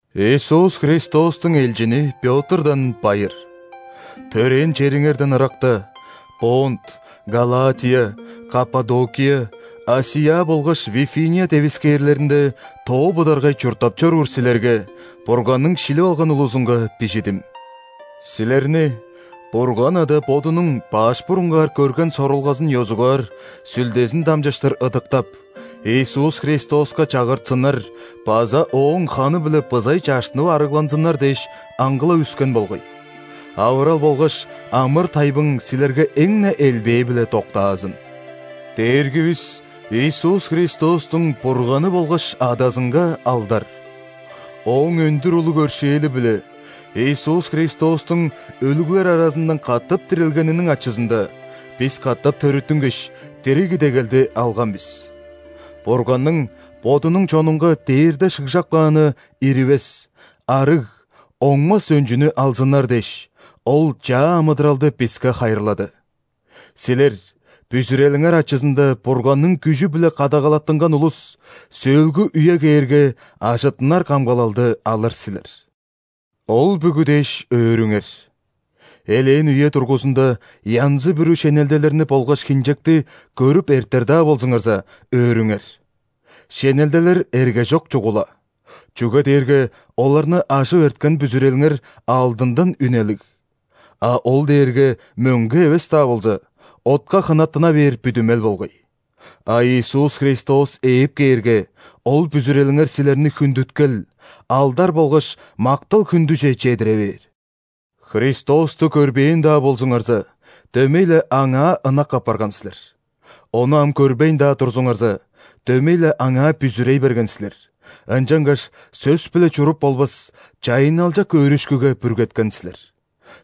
Иисус Христостуң элчини Пётрдан байыр. Төрээн чериңерден ыракта, Понт, Галатия, Каппадокия, ·Асия болгаш Вифиния девискээрлеринде тоо быдаргай чурттап чоруур силерге – Бурганның шилип алган улузунга бижидим. Силерни Бурган Ада Бодунуң баш бурунгаар көрген сорулгазын ёзугаар Сүлдезин дамчыштыр ыдыктап, Иисус Христоска чагыртсыннар база Ооң ханы-биле бызай чаштынып ·арыгланзыннар дээш аңгылап үскен болгай. Авырал болгаш амыр-тайбың силерге эң-не элбээ-биле доктаазын! Дээргивис Иисус Христостуң Бурганы болгаш Адазынга алдар! Ооң өндүр улуг өршээли-биле, Иисус Христостуң өлүглер аразындан катап дирилгениниң ачызында, бис катап төрүттүнгеш, дириг идегелди алган бис. Бурганның Бодунуң чонунга дээрде шыгжап кааны иривес, арыг, оңмас өнчүнү алзыннар дээш, Ол чаа амыдыралды биске хайырлады. Силер, бүзүрелиңер ачызында Бурганның күжү-биле кадагалаттынган улус, сөөлгү үе кээрге ажыттынар камгалалды алыр силер. Ол бүгү дээш, өөрүңер. Элээн үе дургузунда янзы-бүрү шенелделерни болгаш хинчекти көрүп эртер-даа болзуңарза, өөрүңер. Шенелделер эргежок чугула, чүге дээрге оларны ажып эрткен бүзүрелиңер алдындан үнелиг (а ол дээрге мөңге эвес-даа болза, отка хынаттына бээр бүдүмел болгай), а Иисус Христос ээп кээрге, ол бүзүрелиңер силерни хүндүткел, алдар болгаш мактал-хүндүже чедире бээр. Христосту көрбээн-даа болзуңарза, дөмей-ле Аңаа ынак апарган силер. Ону ам көрбейн-даа турзуңарза, дөмей-ле Аңаа бүзүрей берген силер, ынчангаш сөс-биле чуруп болбас чайынналчак өөрүшкүге бүргеткен силер.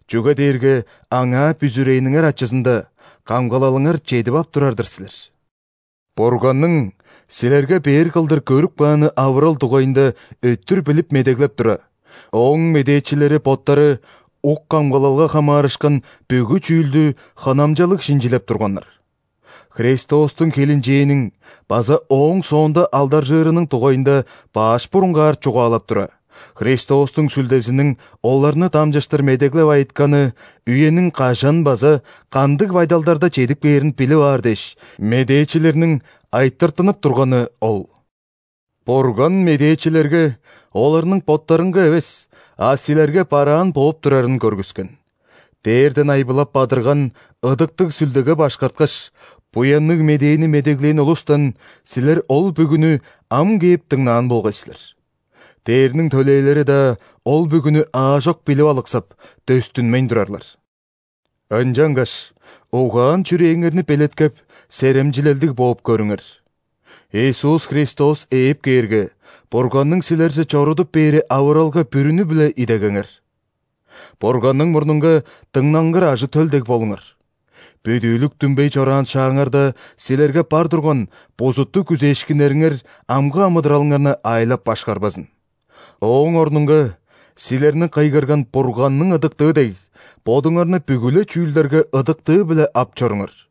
Чүге дээрге Аңаа бүзүрээниңер ачызында камгалалыңар чедип ап турар-дыр силер. Бурганның силерге бээр кылдыр көрүп кааны авырал дугайында өттүр билип медеглеп тура, Ооң медээчилери боттары ук камгалалга хамаарышкан бүгү чүүлдү хынамчалыг шинчилеп турганнар. Христостуң хилинчээниң база ооң соонда алдаржыырының дугайында баш бурунгаар чугаалап тура, Христостуң Сүлдезиниң оларны дамчыштыр медеглеп айытканы үениң кажан база кандыг байдалдарда чедип кээрин билип аар дээш, медээчилерниң айтыртынып турганы ол. Бурган медээчилерге оларның боттарынга эвес, а силерге бараан бооп турарын көргүскен. Дээрден айбылап бадырган Ыдыктыг Сүлдеге башкарткаш, Буянныг Медээни медеглээн улустан силер ол бүгүнү ам кээп дыңнаан болгай силер. Дээрниң төлээлери-даа ол бүгүнү аажок билип алыксап, дөстүнмейн турарлар. Ынчангаш угаан-чүрээңерни белеткеп, серемчилелдиг бооп көрүңер. Иисус Христос ээп кээрге, Бурганның силерже чорудуп бээри авыралга бүрүнү-биле идегеңер. Бурганның мурнунга дыңнангыр ажы-төл дег болуңар, бүдүүлүк дүмбей чораан шааңарда силерге бар турган бузуттуг күзээшкиннериңер амгы амыдыралыңарны аайлап-башкарбазын. Ооң орнунга силерни кыйгырган Бурганның ыдыктыы дег, бодуңарны бүгү-ле чүүлдерге ыдыктыы-биле ап чоруңар.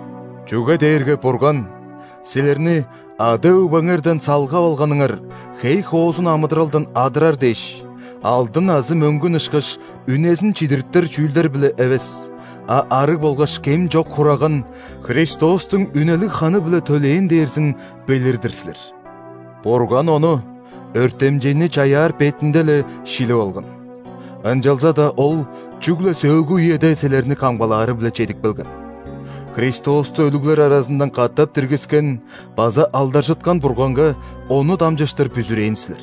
Чүге дээрге Бурган силерни ада-өгбеңерден салгап алганыңар хей-хоозун амыдыралдан адырар дээш, алдын азы мөңгүн ышкаш үнезин чидириптер чүүлдер-биле эвес, а арыг болгаш кем чок Хураган – Христостуң үнелиг ханы-биле төлээн дээрзин билир-дир силер! Бурган Ону өртемчейни чаяар бетинде-ле шилип алган, ынчалза-даа Ол чүгле сөөлгү үеде силерни камгалаары-биле чедип келген. Христосту өлүглер аразындан катап диргискен база алдаржыткан Бурганга Ону дамчыштыр бүзүрээн силер.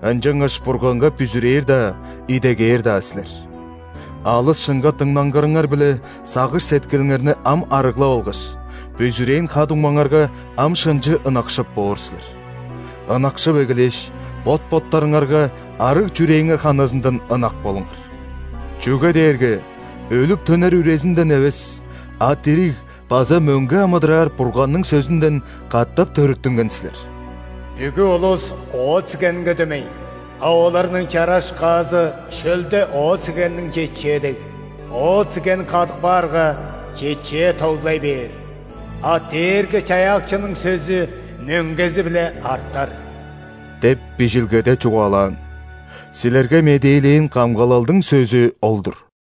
Ынчангаш Бурганга бүзүрээр-даа, идегээр-даа силер. Алыс шынга дыңнангырыңар-биле сагыш-сеткилиңерни ам арыглап алгаш, бүзүрээн ха-дуңмаңарга ам шынчы ынакшып боор силер. Ынакшып эгелээш, бот-боттарыңарга арыг чүрээңер ханызындан ынак болуңар! Чүге дээрге өлүп төнер үрезинден эвес, а дириг база мөңге амыдыраар Бурганның сөзүнден катап төрүттүнген силер. «Бүгү улус оът-сигенге дөмей,а оларның чараш-каазы шөлде оът-сигенниң чечээ дег.Оът-сиген кадып каарга, чечээ тоглай бээр, а Дээрги-Чаяакчының сөзү мөңгези-биле артар» деп Бижилгеде чугаалаан.Силерге медээлээн камгалалдың сөзү ол-дур.